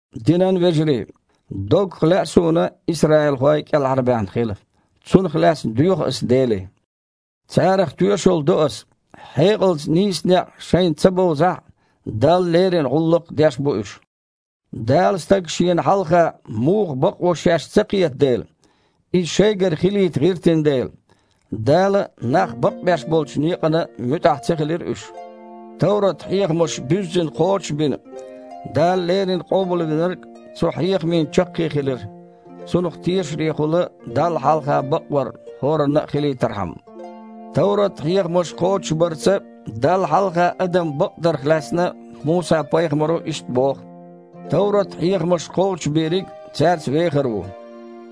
Динан вежарий! Доггах лаьа суна исраилхой а кІелхьарбаьхна хила. Цунах лаьцна доьху аса Деле. Царах тоьшалла до аса: хьекъалца нийса некъ шайна ца бовзахь а, Далла леррина гІуллакх деш бу уьш. Дала стаг Шена хьалха муха бакъво шаьш ца кхета дела, иза шайгара хилийта гІиртина дела, Дала нах бакъбеш болчу некъана муьтІахь ца хилира уьш. Товрат-хьехамаш буьззина кхочуш а бина, Дала леррина Къобалвинарг цу хьехамийн чаккхе хилира, Цунах тешарехула Далла хьалха бакъвар хІоранна а хилийтархьама. Товрат-хьехамаш кхочушбарца Далла хьалха адам бакъдарх лаьцна Муса-пайхамаро иштта боху: «Товрат-хьехамаш кхочушбийриг цаьрца вехар ву».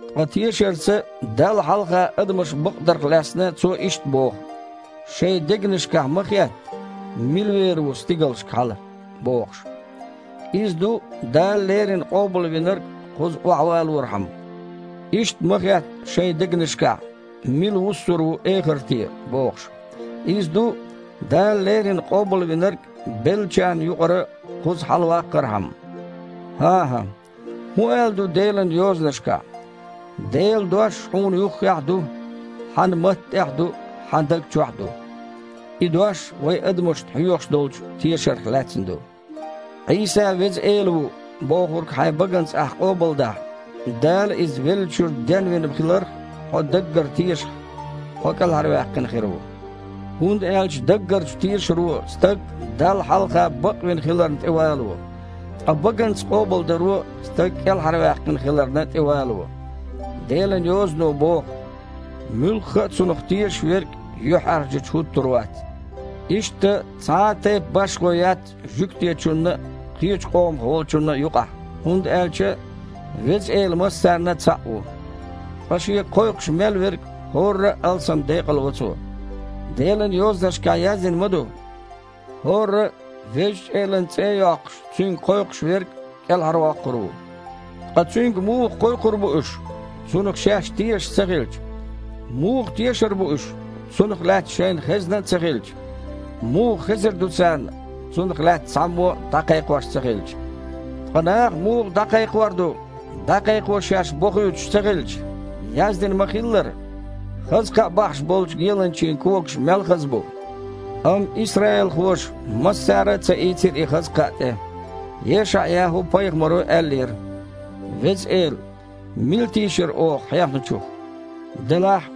Ткъа тешарца Далла хьалха адамаш бакъдарх лаьцна цо иштта боху: «Шайн дегнашкахь ма хетта: „Мила вер ву стигалшка хьала?“ – бохуш», (иза ду Дала леррина Къобалвинарг кхуза охьавалорхьама). «Иштта ма хетта шайн дегнашкахь: „Мила вуссур ву эхарте?“ – бохуш», (иза ду, Дала леррина Къобалвинарг беллачарна юкъара кхуза хьалаваккхархьама). ХІан-хІа! ХІун аьлла ду Делан Йозанашкахь? «Делан дош хьуна юххехь а ду, хьан матта тІехь а ду, хьан дог чохь а ду». И дош вай адамашна хьоьхуш долчу тешарх лаьцна ду. «Іийса Веза Эла ву!» – бохург хьайн баганца ахь къобалдахь, Дала Иза веллачуьра денвина хиларх хьо даггара тешахь, хьо кІелхьарваьккхина хир ву. ХІунда аьлча даггарчу тешаро стаг Далла хьалха бакъвина хиларна тІевалаво, ткъа баганца къобалдаро стаг кІелхьарваьккхина хиларна тІевалаво. Делан Йозано боху: «Муьлхха а Цунах тешаш верг юьхьІаьржачу хІуттур вац». Иштта, цхьа а тайпа башхо яц жуьгтичунна а, кхечу къомах волчунна а юкъахь, хІунда аьлча Веза Эла массарна а цхьаъ ву, ткъа Шега кхойкхуш мел верг хІорра а алссам декъалво Цо. Делан Йозанашкахь яздина ма ду: «ХІорра а, Везачу Элан цІе а йоккхуш, Цуьнга кхойкхуш верг, кІелхьарвоккхур ву». Ткъа Цуьнга муха кхойкхур бу уьш, Цунах шаьш тешаш ца хилча? Муха тешар бу уьш, Цунах лаьцна шайна хезна а ца хилча? Муха хезар ду царна, Цунах лаьцна цхьаммо а дІакхайкхош ца хилча? Ткъа наха муха дІакхайкхор ду, дІакхайкхо шаьш бохуьйтуш ца хилча? Яздина ма-хиллара: « Хаза кхаъ бахьаш болчу геланчийн когаш мел хаза бу!» Амма исраилхоша массара а ца ийцира и хаза кхаъ тІе. ЕшаІ-ЯхІу-пайхамаро аьллера: «Веза Эла! Мила тийшира оха хьехначух?» Делахь,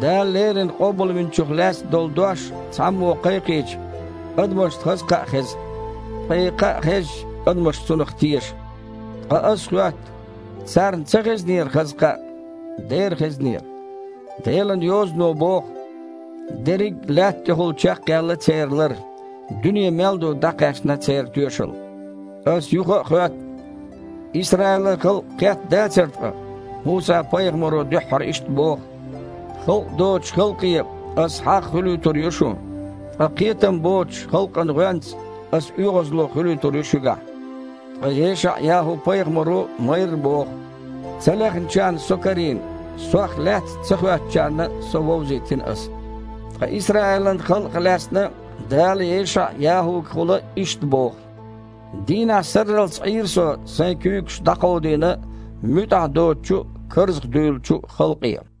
Дала леррина Къобалвинчух лаьцна долу дош цхьаммо кхайкхийча, адамашна хаза кхаъ хеза, ткъа и кхаъ хезча, адамаш Цунах теша. Ткъа аса хоьтту: царна ца хезнера хаза кхаъ? Дера хезнера. Делан Йозано боху: «Дерриг а лаьтта тІехула чекхъяьлла церан лар. Дуьне мел ду дІакхаьчна церан тоьшалла». Аса юха а хоьтту: Исраилан халкъ кхетта дацара ткъа? Муса-пайхамаро дуьххьара иштта боху: «Халкъ доцучу халкъе Ас хьагІ хуьлуьйтур ю шун, ткъа кхетам боцучу халкъан гІоьнца Аса оьгІазло хуьлуьйтур ю шуьгахь». Ткъа ЕшаІ-ЯхІу-пайхамаро майрра боху: «Ца лехначарна Со карийна, Сох лаьцна ца хоьттучарна Со вовзийтина Аса». Ткъа Исраилан халкъах лаьцна Дала ЕшаІ-ЯхІугахула иштта боху: «Дийнахь сарралц Іийра Со Сайн куьйгаш дІакховдийна муьтІахь доцучу а, карзахдуьйлучу а халкъе».